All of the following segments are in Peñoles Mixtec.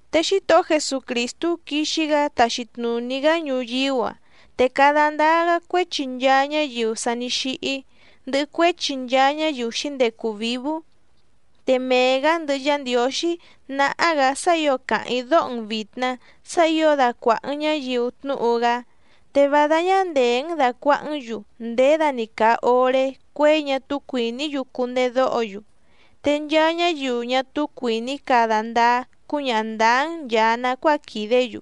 Te Xítohó Jesucrìstú quixi‑gá taxi tnùní‑gá ñuyíú‑a, te cada ndáá‑gá cuéchi nchaa ñáyiu sa ní xíhí, ndɨhɨ cuéchi nchaa ñáyiu xǐndecu vǐvú. Te mee‑gǎ ndɨhɨ Yá Ndiǒxí náhá‑gǎ sá ǐo càháⁿ‑í dóho‑n vìtna sá ǐo dacuàha‑n ñáyiu tnúhu‑gá, te vá dáñá ndèé‑n dàcuahá‑n‑yu nděda‑ni càa oré cuěi ñá túú cuìní‑yu cundedóho‑yu, te nchaa ñáyiu ñá túú cuìní cada ndáá cúñaha ndǎá‑n nchàa nacuáa quìdé‑yu.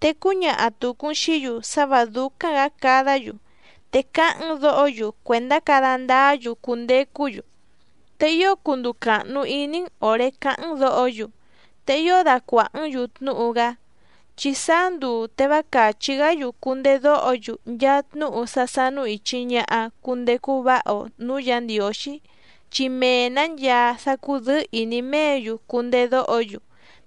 Te cúñaha tùcu‑n xií‑yu sá vǎ dúcáⁿ‑gǎ cadá‑yu, te cáháⁿ‑n dǒho‑yu cuèndá cada ndáá‑yu cundecú‑yu. Te ío cunduu càhnu iní‑n òré cáháⁿ‑n dǒho‑yu, te ío dacuàhá‑n‑yu tnúhu‑gá. Chi sáá nduu te vá càchí‑gá‑yu cundedóho‑yu nchaa tnúhu sá sánú ìchi ñaha cundecu váha‑o nǔú Yǎ Ndiǒxí, chi mee‑nǎ nchaa sá cúdɨ̌ɨ́ ìní méě‑yu cundedóho‑yu,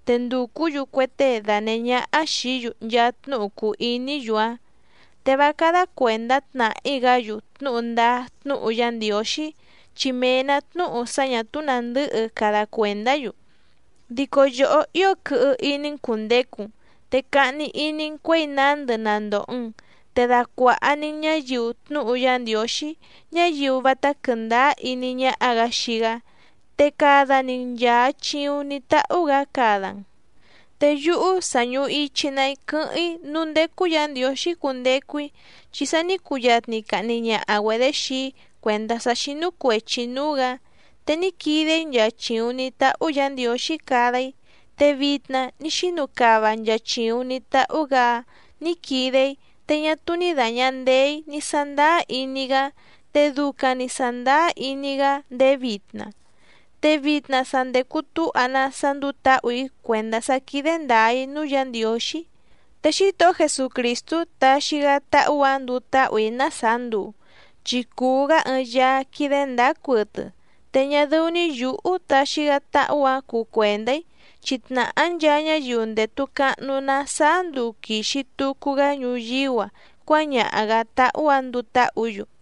te ndùcú‑yu cue tée danèhé ñáhá xìí‑yu nchaa tnúhu cùu iní‑yu‑áⁿ. Te vá cádá cuèndá tnàhí‑gá‑yu tnúhu ndáá tnúhu Yá Ndiǒxí, chi mee‑nǎ tnúhu sá ñà túú nàndɨ́hɨ cada cuèndá‑yu. Dico yòhó ío quɨhɨ iní‑n cùndecu‑n, te cahni iní‑n cuěi nándɨ na ndòho‑n, te dacuàha‑ni‑n ñáyiu tnúhu Yá Ndiǒxí, ñáyiu vátá quɨ̀ndáá iní ñáhá‑gǎ xii‑gá, te cada‑ni‑n nchàa chiuⁿ ní táhú‑gǎ cada‑n. Te yúhú sa ñùhu ichi‑ná‑í quɨ́hɨ́ⁿ‑í núú ndécú Yǎ Ndiǒxí cundecu‑í, chi sa ní cuyatni cahni ñaha‑güedě xii‑í cuèndá sá xínú cuèchi‑í núú‑gǎ. Te ní quide‑í nchaa chìuⁿ ní táhú Yǎ Ndiǒxí cada‑í te vitna ní xínu cava nchaa chìuⁿ ní táhú‑gǎ‑áⁿ nǐ quide‑í, te ñá túú ní dàña ndeé‑í ní sándáá iní‑í‑gá, te ducaⁿ‑ni sàndáá iní‑í‑gá ndéé vitna. Te vitna sa ndècu túha‑ná sá ndúú tǎhù‑í cuèndá sá quídé ndǎá‑í núú Yǎ Ndiǒxí, te Xítohó Jesucrìstú taxi‑gá táhú‑ǎⁿ nduu táhù‑í ná sàá nduu, chi cùu‑gá ɨɨⁿ Yaá quídé ndǎá cuɨtɨ, te ñá dɨ́ú‑ní yǔhú taxi‑gá táhú‑ǎⁿ cuu cuèndá‑í, chi tnàhá nchaa ñáyiu ndètu cahnu‑ná sáá nduu quìxi tucu‑gá ñuyíú‑a cuáñaha‑gǎ táhú‑ǎⁿ nduu táhǔ‑yu.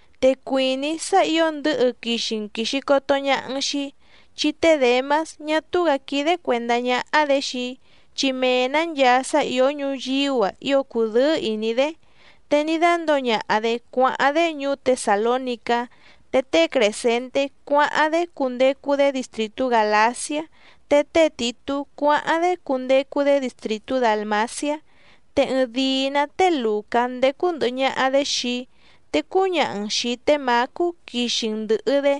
Te cuìní‑í sá ǐo ndɨ̌hɨ quixi‑n quìxi coto ñaha‑n xii‑í. Chi té Děmás ñá túú‑gǎ quídé cuèndá ñáhá‑dě xii‑í, chi mee‑nǎ nchaa sá ìó ñuyíú‑a ío cùdɨ́ɨ́ ìní‑dé. Te ní dándǒo ñaha‑dě cuáháⁿ‑dé ñuú Tesàlónicá, te té Crèscenté cuáháⁿ‑dé cundecu‑dé distrìtú Gàlaciá, te té Tìtú cuáháⁿ‑dé cundecu‑dé distrìtú Dàlmaciá. Te ɨɨⁿdìi‑ná té Lùcá ndécú ndɨ̀hɨ ñaha‑dé xii‑í, te cúñaha‑n xìi té Mǎcú quixi‑n ndɨ̀hɨ‑dé,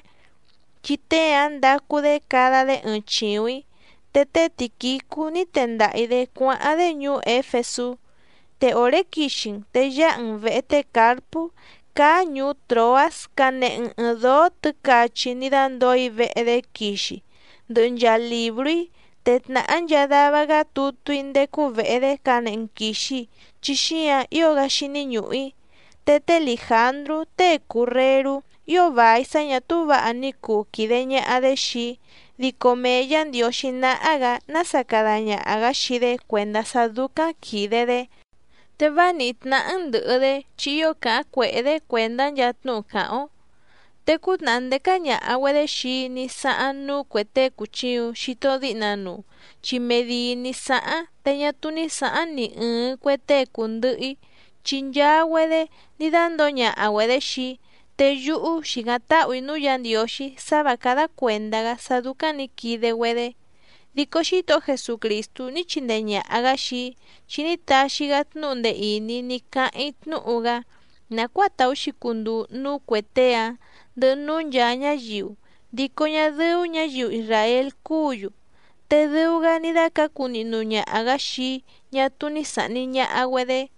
chi tée‑áⁿ ndacu‑dé cada‑dé ɨɨⁿ chìuⁿ‑í. Te té Tìquicú ní tendaha‑ǐ‑dé cuáháⁿ‑dé ñuú Éfesú. Te òré quixi‑n te yáha‑n vèhe té Càrpú cáá ñùú Tròás canehe‑n ɨ̀ɨⁿ dóó tɨ̌cachi ní dándǒo‑í vehe‑dé quixi, ndɨhɨ nchaa lìbrú‑í, te tnàhá nchaa dava‑gá tutú‑í ndécú vèhe‑dé canehe‑n quìxi chi xíǎⁿ ío‑gá xíní ñùhu‑í. Te té Lìjandrú tée cùu rerú ío vài sá ñà túú vǎha ní cuu quìde ñaha‑dé xii‑í, dico mee Yǎ Ndiǒxí náhá‑gǎ nása cada ñaha‑gǎ xii‑dé cuèndá sá dúcáⁿ quìde‑dé. Te vá nìhí tnáhá‑n ndɨ̀hɨ‑dé chi ío càháⁿ cuèhé‑dé cuèndá nchaa tnúhu càháⁿ‑ó. Te cútnàhá ndécá ñàha‑güedé xii‑í ní sáháⁿ núú cuè tée cùchiuⁿ xito díhna nuu, chi mee dìi ní sáháⁿ te ñá túú ní sǎháⁿ ni ɨ̀ɨⁿ cue tée cùndɨhɨ‑í, chi nchaa‑güedé ní dándǒo ñaha‑güedě xii‑í, te yúhú xìcáⁿ táhù‑í núú Yǎ Ndiǒxí sá vǎ cádá cuèndá‑gá sá dúcáⁿ nǐ quide‑güedé. Dico Xítohó Jesucrìstú ní chindee ñàha‑gá xii‑í, chi ní taxi‑gá tnúhu ndee ìní ní cáháⁿ‑í tnúhu‑gá nàcuáa tàú‑xi cunduu núú cuè tée‑áⁿ ndɨhɨ núú nchàa ñáyiu, dico ñá dɨ́ú ñǎyiu isràél cúǔ‑yu, te dɨu‑gá ní dácǎcu nihnu ñaha‑gǎ xii‑í ñá túú ní sàhni ñaha‑güedé.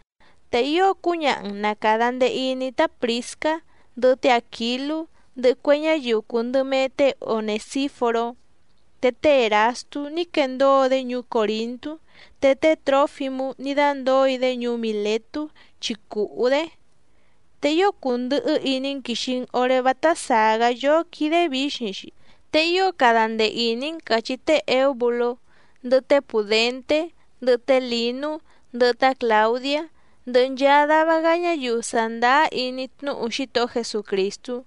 Te ío cúñaha‑n na càda ndee iní tá Prìscá, ndɨhɨ té Àquilú, ndɨhɨ cue ñáyiu cùu ndɨ mee té Onèsíforó. Te té Èrastú ní quendóo‑dé ñuú Còrintú, te té Trǒfimú ní dándǒo‑í‑dé ñuú Mìletú chi cùhú‑dé. Te ío cundɨhɨ́ iní‑n quìxi‑n oré vátá sàá‑gá yóó quídé vǐxiⁿ‑xi. Te ío cada ndee ìní‑n càchí té Èúbulú, ndɨhɨ té Pùdenté, ndɨhɨ té Lǐnú, ndɨhɨ tá Clàudiá, ndɨhɨ nchaa dava‑gá ñáyiu sàndáá iní tnúhu Xítohó Jesucrìstú.